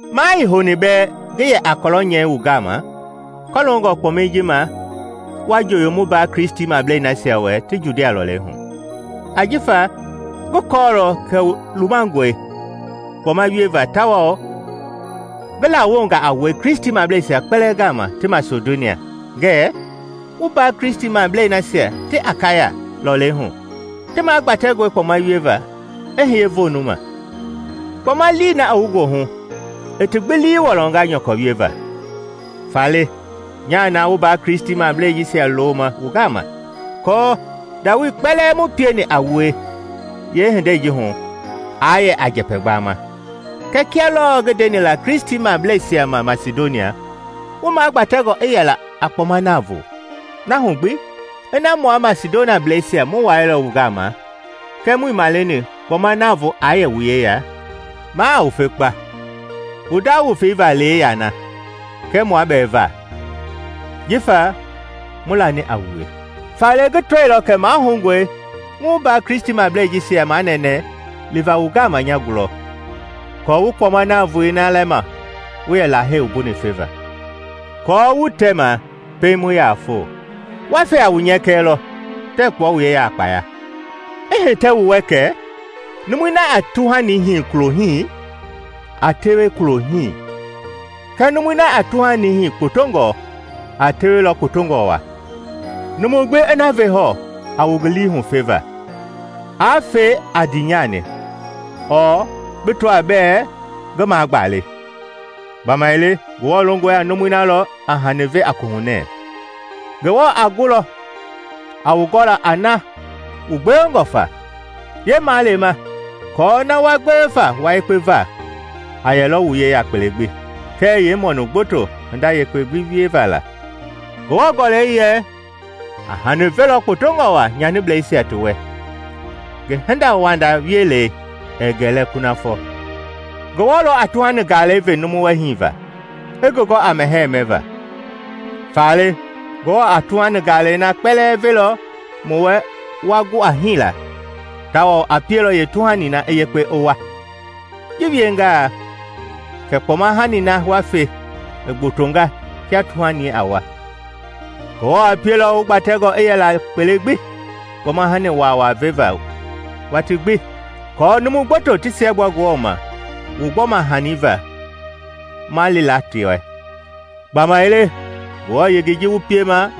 Maa ii houni bɛɛ ngi yɛ a kɔlɔ nyɛi wu gama kɔloongɔ kpɔmɛi ji ma wa njoyo mu mbaa Kristimablei nasia wɛ ti Judia lɔlei hu. Ajifa ngi kɔɔlɔ kɛ wu lumangɔe kpɔma wieva tawao ngi lawonga a wue Kristimableisia kpɛlɛɛ gama ti Masidonia ngɛɛ, “Mu mbaa Kristimablei nasia ti Akaya lɔlei hu ti magbatɛngɔe kpɔma wieva i hiye voonu ma.” Kpɔma lii na i wu goohu i ti gbi lii wɔlɔnga nyɔkɔ wieva. Faale nyaa na mu mbaa Kristimablei jisia looma wu gama aako ndawoei kpɛlɛɛ mu pieni a wue yeehindei ji hu aa yɛ a njɛpɛ gbama. Kɛɛ kia lɔɔ ngi ndeni la Kristimableisia ma Masidonia, wu magbatɛngɔ a yɛla a kpɔma navoo. Na hu gbi, ina mua Masidoniableisia mu wailɔ wu gama kɛɛ muii maleni kpɔma navoo aa yɛ wu yeya, maa a wufe kpa, wu nda wufei va lee yana, kɛ mua bɛ va, jifa mu lani a wue. Faale ngi tɔilɔ kɛ mahoungɔe ngi mu mbaa Kristimablei jisia manɛnɛ liva wu gama nya gulɔ aako wu kpɔma navoei na lɛma wu yɛ Lahei wumbuni feva; aako wu tɛma pɛiŋ mu yaa foo. Wa fe a wu nyɛkɛ lɔ, tɛɛ kpua wu yeya a kpaya. I hitɛ wu wɛ kɛ numui na a tuhani hii kulo hii, a tewe kulo hii; kɛɛ numui na a tuhani hii kpotongɔ, a tewelɔ kpotongɔ waa. Numu gbi i na ve hɔɔ a wu ngi lii hu feva; aa fe a ndiinyani ɔɔ bi tɔaa bɛɛ ngi magba le, gbamaile Ngewɔ longɔ a numui na lɔ a hani ve a kohunɛ. Ngewɔ a gulɔ a wu gɔla a na wu gbewengɔ fa yeemaalema aako na wa gbewe fa wua yekpe va a yɛlɔ wu yeya kpele gbi kɛɛ yeemɔnu gboto hinda yekpe gbi wieva la. Ngewɔ Gɔlɛi yɛ, “A hani velɔ kpotongɔ waa nyanibleisia ti wɛ; ngi hindawanda wielei ɛɛ gɛlɛ kunafɔ.” Ngewɔ lɔ a tuhani galɛi ve numu wɛ hiiva, i ngi gɔ a mɛhɛɛ mɛva. Faale Ngewɔ a tuhani galɛi na kpɛlɛɛ velɔ wu wɛ wa gu a hiila tawao a pielɔ yeetuhani i yekpe, i wua. Ji wiengaa kɛ kpɔma-hani na wa fe i gbotonga kia tuhani a wua. Ngewɔ a pielɔ wu gbatɛngɔ i yɛla kpele gbi kpɔma-hani waawaa veva watii gbi aako numu gboto ti siɛgbua Ngewɔ ma wu gbɔma-hani va ma li la ti wɛ. Gbamaile ngengei ji wu piema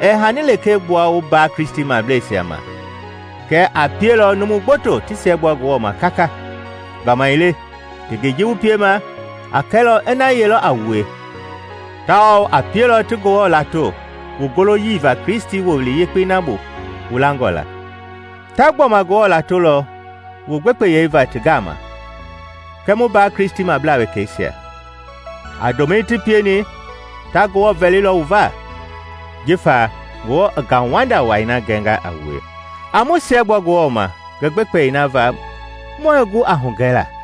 ɛɛ haani lekee gbua wu mbaa Kristimableisia ma kɛɛ a pielɔ numu gboto ti siɛgbua Ngewɔ ma kaka. Gbamaile ngengei ji wu piema a kɛlɔ ina yeelɔ a wue, tawao a pielɔ ti Ngewɔ lato, wu goloyii va Kristi Wowili Yekpei na bu wu langɔ la. Ta gbɔma Ngewɔ latolɔ wu gbekpeyei va ti gama kɛɛ mu mbaa Kristimablaa wekeisia. A ndomɛi ti pieni, ta Ngewɔ vɛlilɔ wu va, jifa Ngewɔ i ngauwanda wai na gɛngɔ a wue. A mu siɛgbua Ngewɔ ma ngi gbekpeyei na va mue gu a hugɛla.